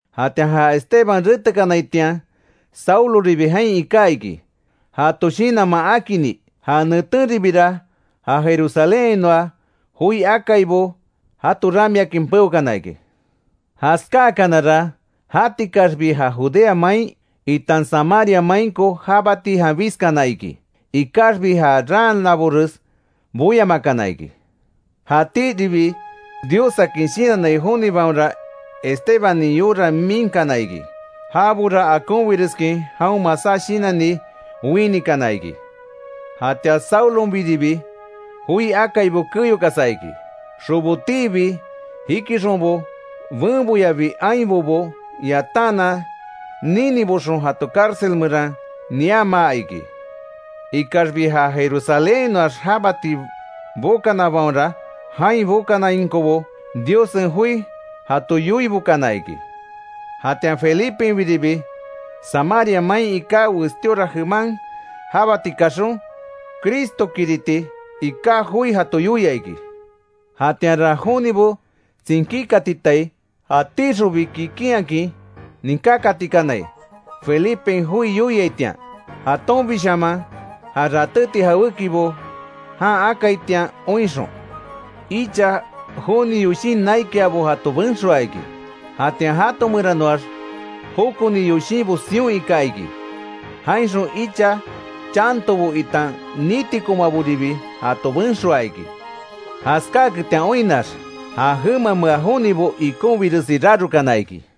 Jatian ja Esteban retekanaitian, Sauloribi jain iká iki jato shinanman akini. Ja netenribira, ja Jerusalénhainoa joi akaibo jato ramiakin peokana iki. Jaskáakanara, jatikaxbi ja Judea main, itan Samaria mainko jabati janbiskana iki. Ikaxbi ja raanabores boyamakana iki. Jatíribi Diossakin shinannai jonibaonra, Estebanin yora miinkana iki. Jabora akonbireskin jaon masá shinanni, winikana iki. Jatian Saulonbiribi, joi akaibo keyokasa iki. Xobotiibi jikixonbo, benboyabi ainbobo yataanan niniboxon jato cárcel meran niamaa iki. Ikaxbi ja Jerusalénhainoax jabati bokanabaonra, jain bokanainkobo, Diossen joi jato yoibokana iki. Jatian Felipenbiribi Samaria main iká westíora jeman jabati kaxon, Cristokiriti iká joi jato yoia iki. Jatianra jonibo tsinkíkatitai, jatíxonbi kikinhakin ninkákatikanai Felipen joi yoiaitian, jatonbishaman ja ratéti jawékibo jan akaitian oinxon. Icha joni yoshin naikiabo jato benxoaa iki. Jatian jato meranoax jokoni yoshinbo sion ika iki. Jainxon icha chantobo itan nitikomaboribi jato benxoaa iki. Jaskáaketian oinnax, ja jemamea jonibo ikonbiresi rarokana iki.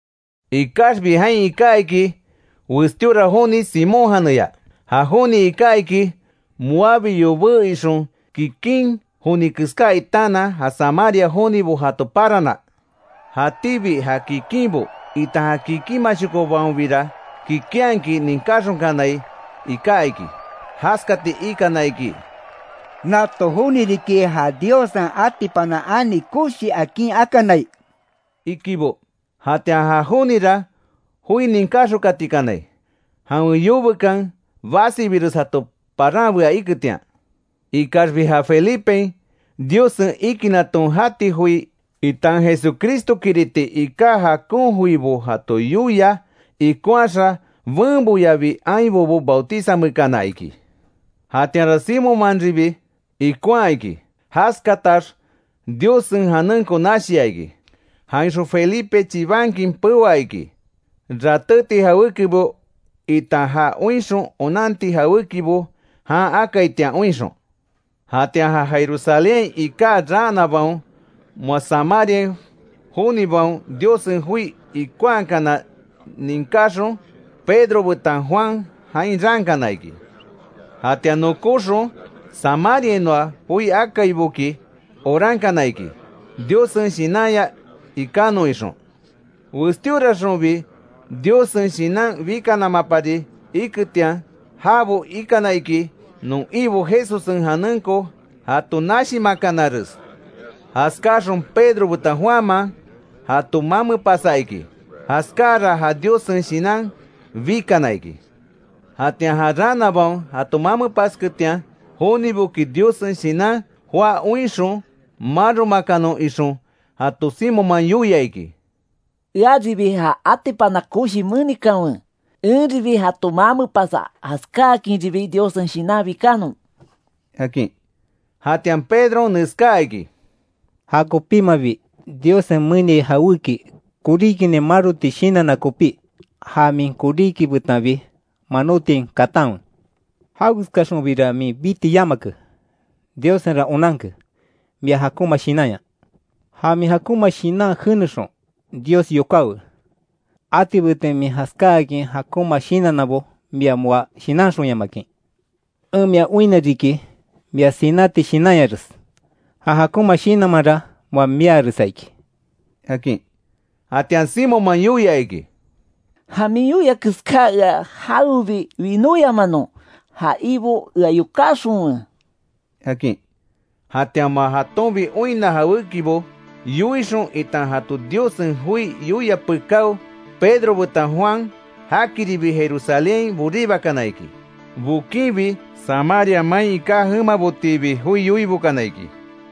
Ikaxbi jain iká iki westíora joni Simón janeya. Ja joni iká iki, moabi yobé ixon, kikin joni keská itaanan ja Samaria jonibo jato parana. Jatíbi ja kikinbo, itan kikinmashokobaonbira kikinhakin ninkáxonkanai iká iki; jaskati ikana iki: “Nato joni riki ja ‘Diossen atipana ani koshi akin akanai’”, ikibo. Jatian ja jonira, joi ninkáxonkatikanai, jawen yobekan basibires jato paranbea iketian. Ikaxbi ja Felipen, Diossen ikinaton jati joi, itan Jesucristokiriti iká jakon joibo jato yoia ikonhaxa, benboyabi, ainbobo, bautizamekana iki. Jatianra Simónmanribi ikonhaa iki. Jaskatax Diossen janenko nashia iki. Jainxon Felipe chibankin peoa iki, ratéti jawékibo, itan ja oinxon onanti jawékibo jan akaitian oinxon. Jatian ja Jerusalénhain iká raanabaon, moa Samaria jonibaon Diossen joi ikonhakana ninkáxon, Pedro betan Juan jain raankana iki. Jatian nokóxon, Samariainoa joi akaiboki orankana iki, Diossen Shinanya ikanon ixon, westíoraxonbi Diossen Shinan bikanamapari iketian. Jabo ikana iki, non Ibo Jesussen janenko jato nashimakanares. Jaskáaxon Pedro betan Juanman, jato mamepasa iki. Jaskáara ja Diossen Shinan bikana iki. Jatian ja raanabaon jato mamepasketian joniboki Diossen Shinan joá oinxon, maromakanon ixon jato Simonman yoia iki: —Earibi ja atipana koshi menikanwe, enribi jato mamepasa, jaskáakinribi Diossen Shinan bikanon —akin. Jatian Pedron neskaa iki: —¡Ja kopímabi Diossen meniai jawéki, koríkinin maroti shinanna kopí, ja min koríki betanbi manotiain katanwe!, jawekeskaxonbira min biti yamake. Diossenra onanke, mia jakonma shinanya. Ja min jakonma shinan jenexon, Dios yokáwe. Atibetin min jaskáakin jakonma shinannabo mia moa shinanxonyamakin. En mia oinna riki, mia sináti shinanyares, ja jakonma shinanmanra moa miaaresa iki —akin. Jatian Simonman yoia iki: —Ja min yoia keská ea jawebi winóyamanon, ja Ibo ea yokáxonwe —akin. Jatian moa jatonbi oinna jawékibo yoixon, itan jato Diossen joi yoia pekáo, Pedro betan Juan jakiribi Jerusalénhain boribakana iki. Bokinbi Samaria main iká jemabotiibi joi yoibokana iki.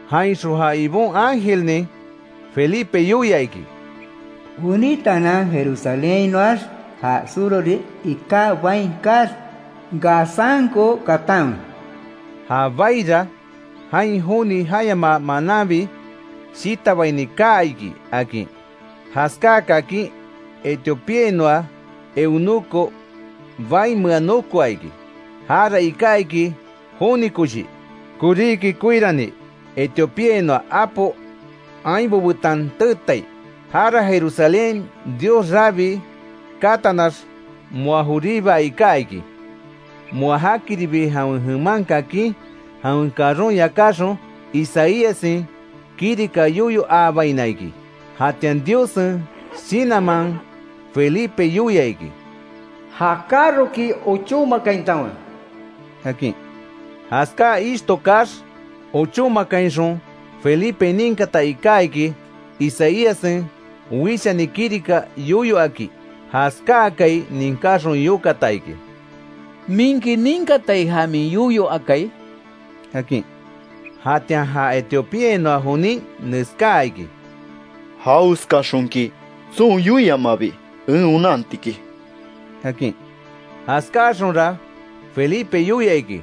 Jainxon ja Ibon ángelnin, Felipe yoia iki: “Wenítaanan, Jerusalénhainoax, ja surhori iká bain kaax, Gazanko katanwe”. Ja baira, jain joni jayamaa mananbi shitabini kaa iki, akin. Jaskaa kakin, Etiopíainoa eunuco baimea nokoa iki. Jara iká iki joni koshi, koríki koirani Etiopíainoa apo ainbo betan teetai. Jara Jerusalénhain Dios rabii katanax, moa joribai iká iki. Moa jakiribi jawen jeman kakin, jawen carron yakáxon, Isaíassen kirika yoyo aabaina iki. Jatian Diossen Shinanman Felipe yoia iki: “Ja carroki ochómakaintanwe”, akin. Jaskáa ishto kaax ochómakainxon Felipen ninkata iká iki, Isaíassen wishani kirika yoyo aki. Jaskáakai ninkáxon yokata iki: —¿Minki ninkatai ja min yoyo akai? —akin. Jatian ja Etiopeainoa jonin neskaa iki: —¿Jawekeskaxonki tson yoiamabi en onantiki? —akin. Jaskáaxonra Felipe yoia iki,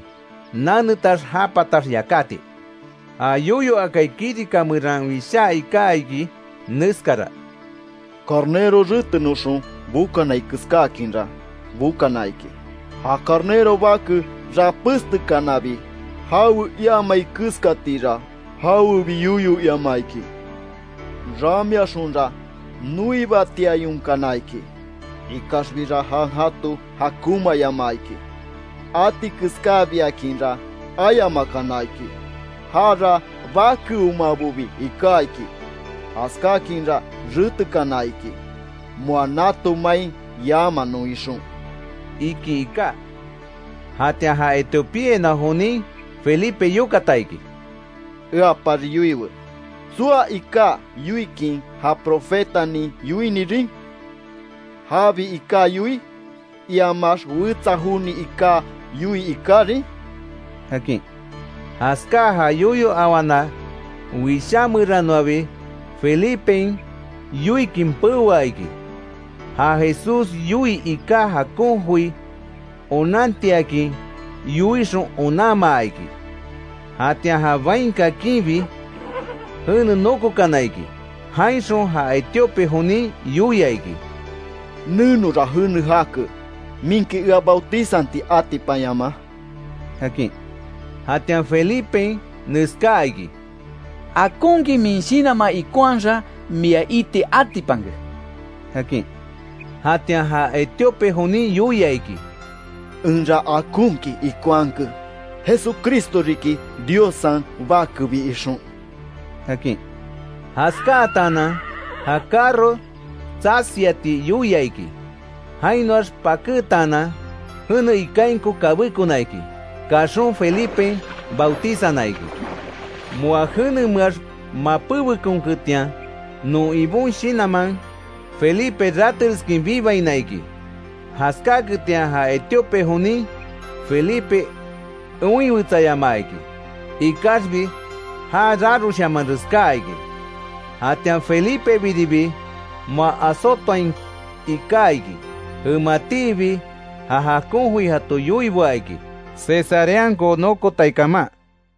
nanetax já patax yakáti. Ja yoyo akai kirika meran wishaa iká iki neskara: “Carnero retenoxon bokanai keskáakinra, bokana iki. Ja carnero bake rapéstekanabi jawe iamai keskatira, jawebi yoyo iamaa iki. Ramiaxonra noibatiayonkana iki, ikaxbira jan jato jakonmaayamaa iki. Atikeskabiakinra ayamakana iki; jara bakeomabobi iká iki. Jaskákinra retekana iki, moa nato main yamanon ixon”, iki iká. Jatian ja Etiopeainoa jonin, Felipe yokata iki: —Eapari yoiwe ¿Tsoa iká yoikin, ja profetanin yoinirin? ¿Jabi iká yoii, iamax wetsa joni iká yoii ikarin? —akin. Jaskáa ja yoyo awana wishá meranoabi Felipen yoikin peoa iki, ja Jesús yoii iká jakon joi onantiakin yoixon onanmaa iki. Jatian ja bain kakinbi, jene nokokana iki. Jainxon ja Etiope jonin yoia iki: —Nenora jene jake ¿Minki ea bautizanti atipanyamaa? —akin. [Jatian Felipen neskaa iki: —Akonkin min shinanman ikonhaxa, mia iti atipanke —akin. Jatian ja Etiope jonin yoia iki: —Enra akonkin ikonhake, Jesucristo riki Diossen Bakebi ixon] —akin. Jaskátaanan ja carro tsasiati yoia iki, jainoax pakétaanan jene ikainko kabékona iki, kaxon Felipen bautizana iki. Moa jenemeax, mapébekonketian non Ibon Shinanman, Felipe ratereskin bibaina iki. Jaskáketian ja Etiope jonin Felipe oinwetsayamaa iki. Ikaxbi já raroshamanres kaa iki. Jatian Felipebiribi moa Azotoain iká iki. Jematiibi ja jakon joi jato yoiboa iki, Cesareanko nokotai kaman.